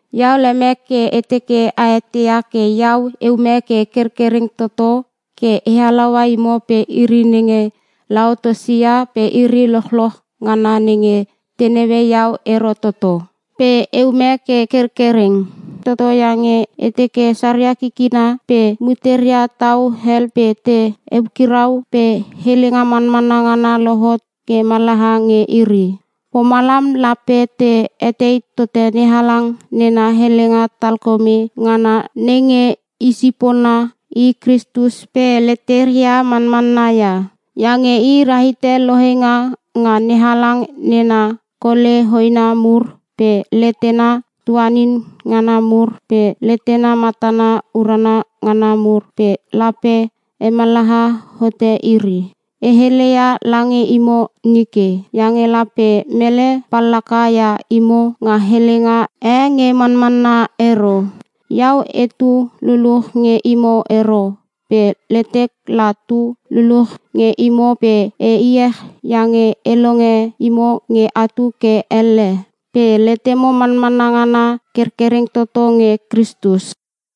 Iau lemek ke e teke a eteia ke iau eume ke kerkereng toto ke e halaua imo pe iri nenge Laotisia pe iri lochloch ngana nenge te naue iau ero toto. Pe eume ke kerkereng toto iange e teke saria kikina pe muteria tau hel pe te eukirau pe helenga manmanna ngana lohot ke mallaha nge iri. Pomalam lape te etei tote NeHalang nena helenga talkome ngana nenge isipona i Kristus pe leteria manmanna ia. Iange i rahite lohenga nga NeHalang nena kole hoena mur pe letena tuanin ngana mur pe letena matana urana ngana mur pe lape hemallaha hote iri. E heleia lange imo nike iange lape mele pallaka ia imo nga helenga e nge manmanna ero. Iau etu luluch nge imo ero pe letek la tu luluch nge imo pe e iech iange e longe imo nge atu ke elle pe letemo manmanna ngana kerkereng toto nge Kristus.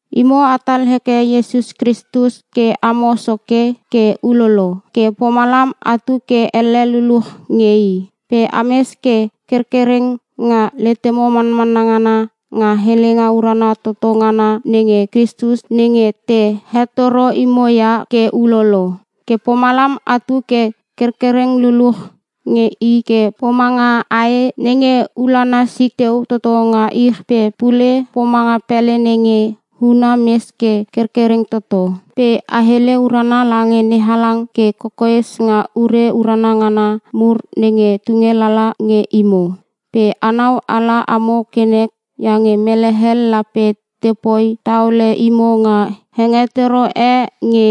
Imo atal heke Iesus Kristus ke amo Soke ke ulolo ke pomalam atu ke elle luluch nge i. Pe ames ke kerkereng nga letemo manmanna ngana nga helenga urana toto ngana nenge Kristus nenge te hetoro imo ia ke ulolo, ke pomalam atu ke kerkereng luluch nge i ke pomanga ae nenge ulana sik teu toto nga ich pe pule pomanga pele nenge huna mes ke kerkereng toto. Pe a hele urana lange NeHalang ke kokoes nga ure urana ngana mur nenge tunge lala nge imo. Pe anau ala amo ke nek iange mele hel lape tepoi taole imo nga hengetoro e nge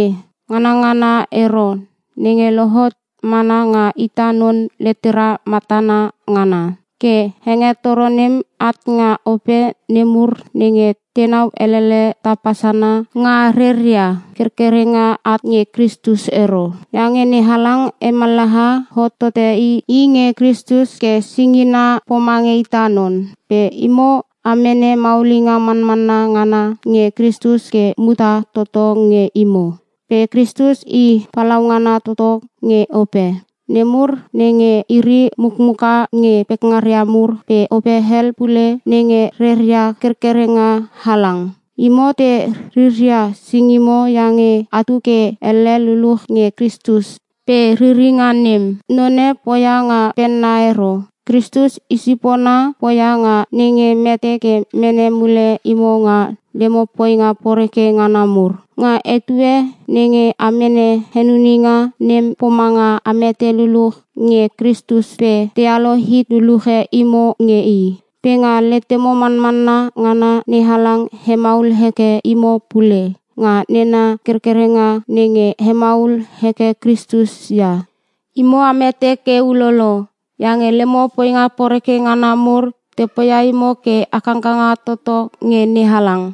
nganangana ero nenge lohot mana nga ita non letera matana ngana. Ke hengetoro nem at nga ope nemur nenge tenau elele tapa sana nga reria kerkerenga, at nge Kristus ero. Iange NeHalang hemallaha hot tote i nge Kristus ke singina pomange ita non pe imo a mene maulinga manmanna ngana nge Kristus ke muta toto nge imo. Pe Kristus i palaungana toto nge ope nemur nenge iri mukmuka nge pekngaria mur pe ope hel pule nenge reria kerkerenga halang. Imo te riria singimo iange atu ke elle luluch nge Kristus pe riringa nem none poia nga penna ero. Kristus isipona poia nga nenge mete ke mene mule imo nga lemo poinga poreke ngana mur. Nga etue nenge a mene henuninga, nem pomanga a mete luluch nge Kristus pe tealo hit luluche imo nge i. Pe nga letemo manmanna ngana NeHalang hemaul heke imo pule nga nena kerkerenga nenge hemaul heke Kristus ia. Imo a mete ke ulolo, iange lemo poinga poreke ngana mur te poia imo ke a kangkanga toto nge NeHalang.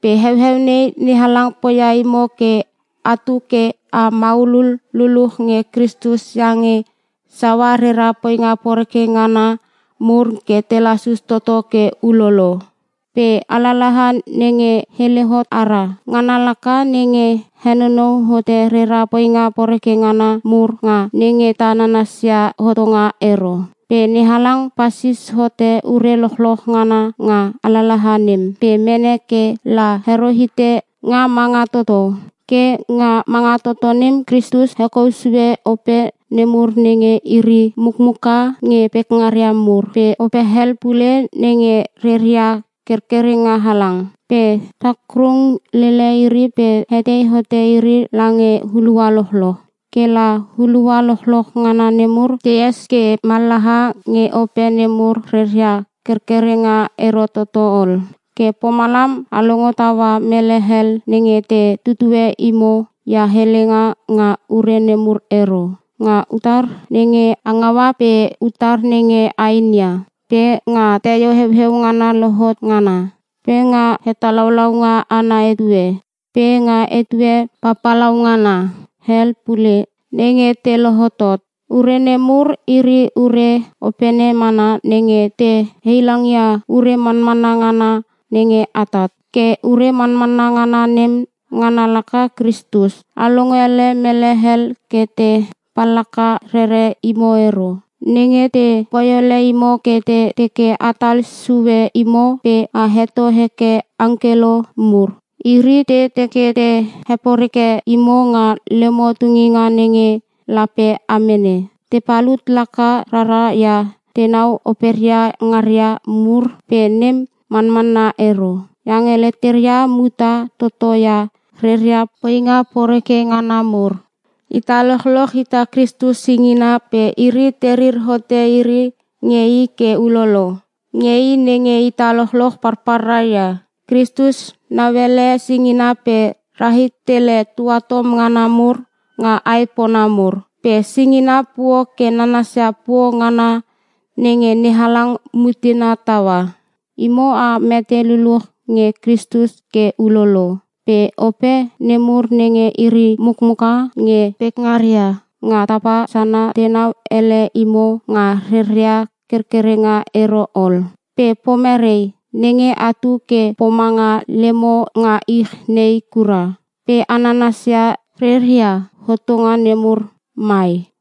Pe heueu nei NeHalang poia imo ke atu ke a maulul luluch nge Kristus iange saua rera poinga poreke ngana mur ke te lasus toto ke ulolo. Pe alalaha nenge hele hot ara, ngana laka nenge henonou hote rera poinga poreke ngana mur nga nenge ta nanasia hotonga ero. Pe NeHalang pasis hote ure lochloch ngana nga alalaha nem pe mene ke la hero hite nga manga toto. Ke nga manga toto nem Kristus hekou sue ope nemur nenge iri mukmuka nge pekngaria mur pe ope hel pule nenge reria kerkerenga halang. Pe takrung lele iri pe hetei hote iri lange hulua lochloch. Ke la hulua lochloch ngana nemur te es ke mallaha nge ope nemur reria kerkerenga ero toto ol. Ke pomalam a longo taua mele hel nenge te tutue imo ia helenga nga ure nemur ero: Nga utar nenge a ngaua pe utar nenge a inia, pe nga teio heueu ngana lohot ngana, pe nga hetalaulaunga ana etue, pe nga etue papalaungana hel pule nenge te lohotot. Ure nemur iri ure opene mana nenge te heilangia ure manmanna ngana nenge atat. Ke ure manmanna ngana nem ngana laka Kristus. A longele mele hel ke te pallaka rere imo ero, nenge te poi ole imo ke te teke atal sue imo pe a heto heke angkelo mur. Iri te teke te heporeke imo nga lemo tunginga nenge lape a mene. Te palut laka rara ia tenau operia ngaria mur pe nem manmanna ero iange leteria muta toto ia reria poinga poreke ngana mur. Ita lochloch ita Kristus singina pe iri terir hote iri nge i ke ulolo, nge i nenge ita lochloch palpalra ia. Kristus nauele singina pe rahit tele tuatom ngana mur nga aepona mur. Pe singina puo ke nanasia puo ngana nenge NeHalang mutena taua. Imo a mete luluch nge Kristus ke ulolo. Pe ope nemur nenge iri mukmuka nge pekngaria mur nga tapa sana tenau ele imo nga reria kerkerenga ero ol. Pe pomerei nenge atu ke pomanga lemo nga ich nei kura, pe a nanasia reria hotonga nemur mai?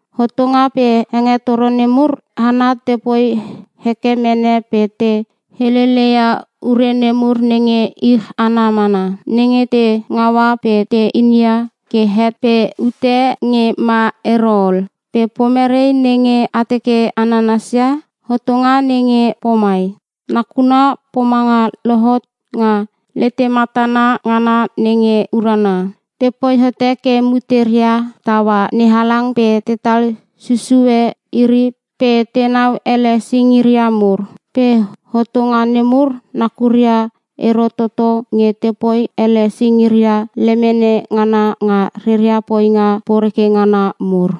Hotonga pe hengetoro nemur hana tepoi heke mene pe te helele ia ure nemur nenge ich ana mana, nenge te ngaua pe te inia ke het pe ute nge ma ero ol. Pe pomerei nenge a teke a nanasia? Hotonga nenge pomai, nakuna pomanga lohot nga letematana ngana nenge urana. Tepoi hote ke muteria taua NeHalang pe tetal susue iri pe tenau ele singiria mur. Pe hotonga nemur nakuria ero toto nge tepoi ele singiria lemene ngana nga reria poinga poreke ngana mur.